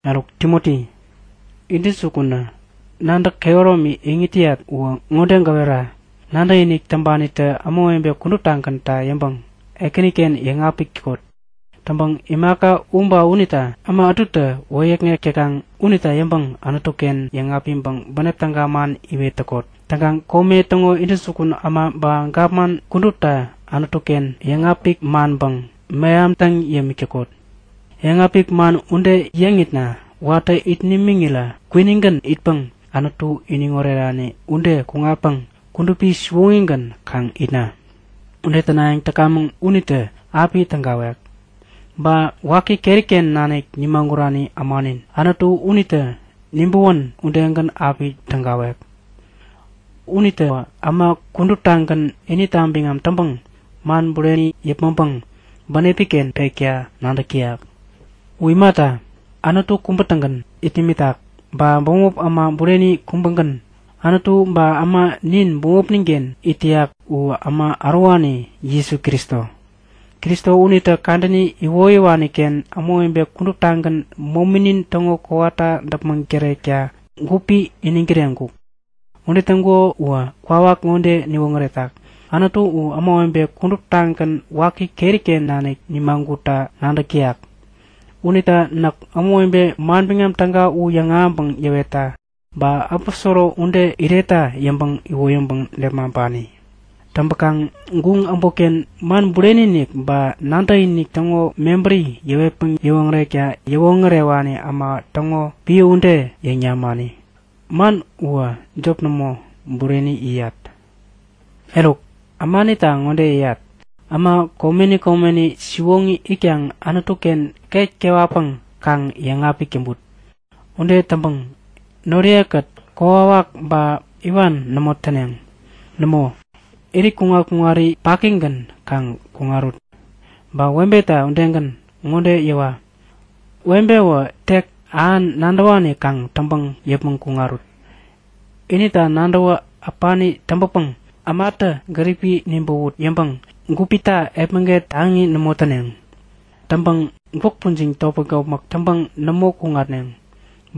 Eruk Timoti, intäjukunä nadäk kehäromi iŋit täyat uwä ŋode gäwera; Nadäkinik täŋpanitä ämawebe kuduptagänta yäŋpäŋ Ekäniken yäŋapik täkot. Täŋpäŋ imaka u ba unita äma ätutä wäyäkŋek täkaŋ unita yäŋpäŋ Anutu-ken yäŋapiŋpäŋ bänep täga man iwet täkot. Täŋkaŋ kome täŋo intäjukun äma ba gapman kudupta Anutu-ken yäŋapik manpäŋ mehamtäŋ yämik täkot. Yäŋapik man ude yäŋitna watä it nimiŋirä kwinigän itpäŋ Anutu iniŋ orerani ude kuŋatpäŋ kudupi siwoŋigän kaŋ itna. Ude tänayäŋ täkamäŋ unitä api tägawek. Ba waki keri-ken nanik nimagurani ämanin Anutu unitä nibäwän udegän api tägawek. Unitäwä äma kuduptagän inita biŋam täŋpäŋ man bureni yäpmäŋpäŋ bänepi-ken pekta nadäk täyak. U imata, Anutu kubä-tägän it nimitak. Ba bämop äma bureni kubägän, Anutu ba äma nin bämopnin-ken it täyak u äma äworewani Jesu Kristo. Kristo unitä kadäni iwoyäwani-ken ämawebe kuduptagän mominin täŋo kowata däpmäŋ tärekta gupi iniŋ kireŋkuk. Ude täŋkuko uwä kwawak ŋode niwoŋäretak; Anutu u ämawebe kuduptagän waki keri-ken nanik yämagutta nadäk täyak. Unita näk ämawebe Manbiŋam Täga u yäŋahäŋpäŋ yäwetta ba aposoro ude iretta yäŋpäŋ iwoyäŋpäŋ nepmaŋpani. Täŋpäkaŋ guŋ äbotken man bureni-inik ba nadäkinik täŋo mebäri yäwetpäŋ yäwoŋärekta yäwoŋärewani äma täŋo piä ude yäŋ namani. Man uwä jop nämo, bureni yäyat! Eruk, ämanita ŋode yäyat; Äma komeni komeni, siwoŋi itkaŋ Anutu-ken ket kewatpäŋ kaŋ yäŋapik täŋput. Ude täŋpäŋ noriye-kät kokwawak ba iwan nämo täneŋ. Nämo, irit kuŋat-kuŋari pakigän kaŋ kuŋarut. Ba webeta udegän ŋode yäwa; Webewä tek ähan nadäwani kaŋ täŋpäŋ yäpmäŋ kuŋarut. Inita nadäwä äpani täŋpäpäŋ ämatä gäripi nibäwut yäŋpäŋ gupita epmäget taŋi nämo täneŋ. Täŋpäŋ gwäk pujiŋ topmäk-topmäk täŋpäŋ nämo kuŋatneŋ.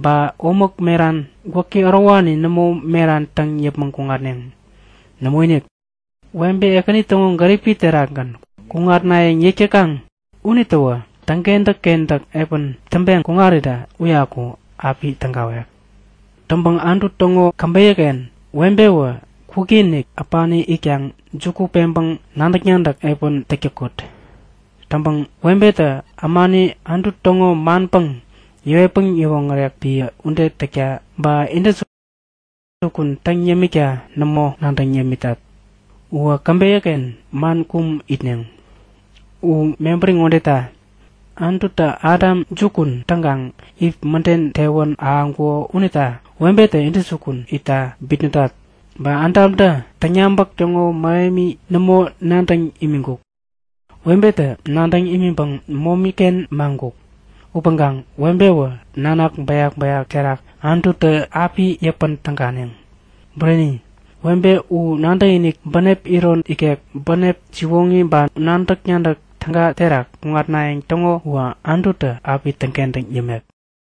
Ba omäk meran, gwäki ärowani nämo meran täŋ yäpmäŋ kuŋatneŋ. Nämoinik. Webe, Ekäni täŋo gäripi terakgän kuŋatnayäŋ yäk täkaŋ unitäwä täŋkentäk-kentäk piä täŋpeŋ kuŋarirä uyaku api tägawek. Täŋpäŋ Anutu täŋo käbeyä-ken webewä, kwikinik äpani itkaŋ juku peŋpäŋ nadäk-nadäk piä täk täkot. Täŋpäkaŋ webetä ämani Anutu täŋo manpäŋ yäwetpäŋ yäwoŋärek piä ude täkta ba intäjukun täŋ yämikta nämo nadäŋ yämitat. Uwä käbeyä-ken man kum itneŋ. U mebäri ŋodeta; Anututä Adam jukun täŋkaŋ Iv mäden tewän ahäŋkuko unita webetä intäjukun itta bitnätat. Ba Adamtä täŋyabäk täŋo mähemi nämo nadäŋ imiŋkuk. Webenitä nadäŋ imiŋpäŋ momi-ken maŋkuk. Upäŋkaŋ webewä nanak bäyak-bäyak terak Anututä api yäpän täganeŋ. Bureni, webe u nadäkinik, bänep iron ikek, bänep siwoŋi ba nadäk-nadäk täga terak kuŋatnayäŋ täŋo uwä Anututä api täŋkentäŋ yämek.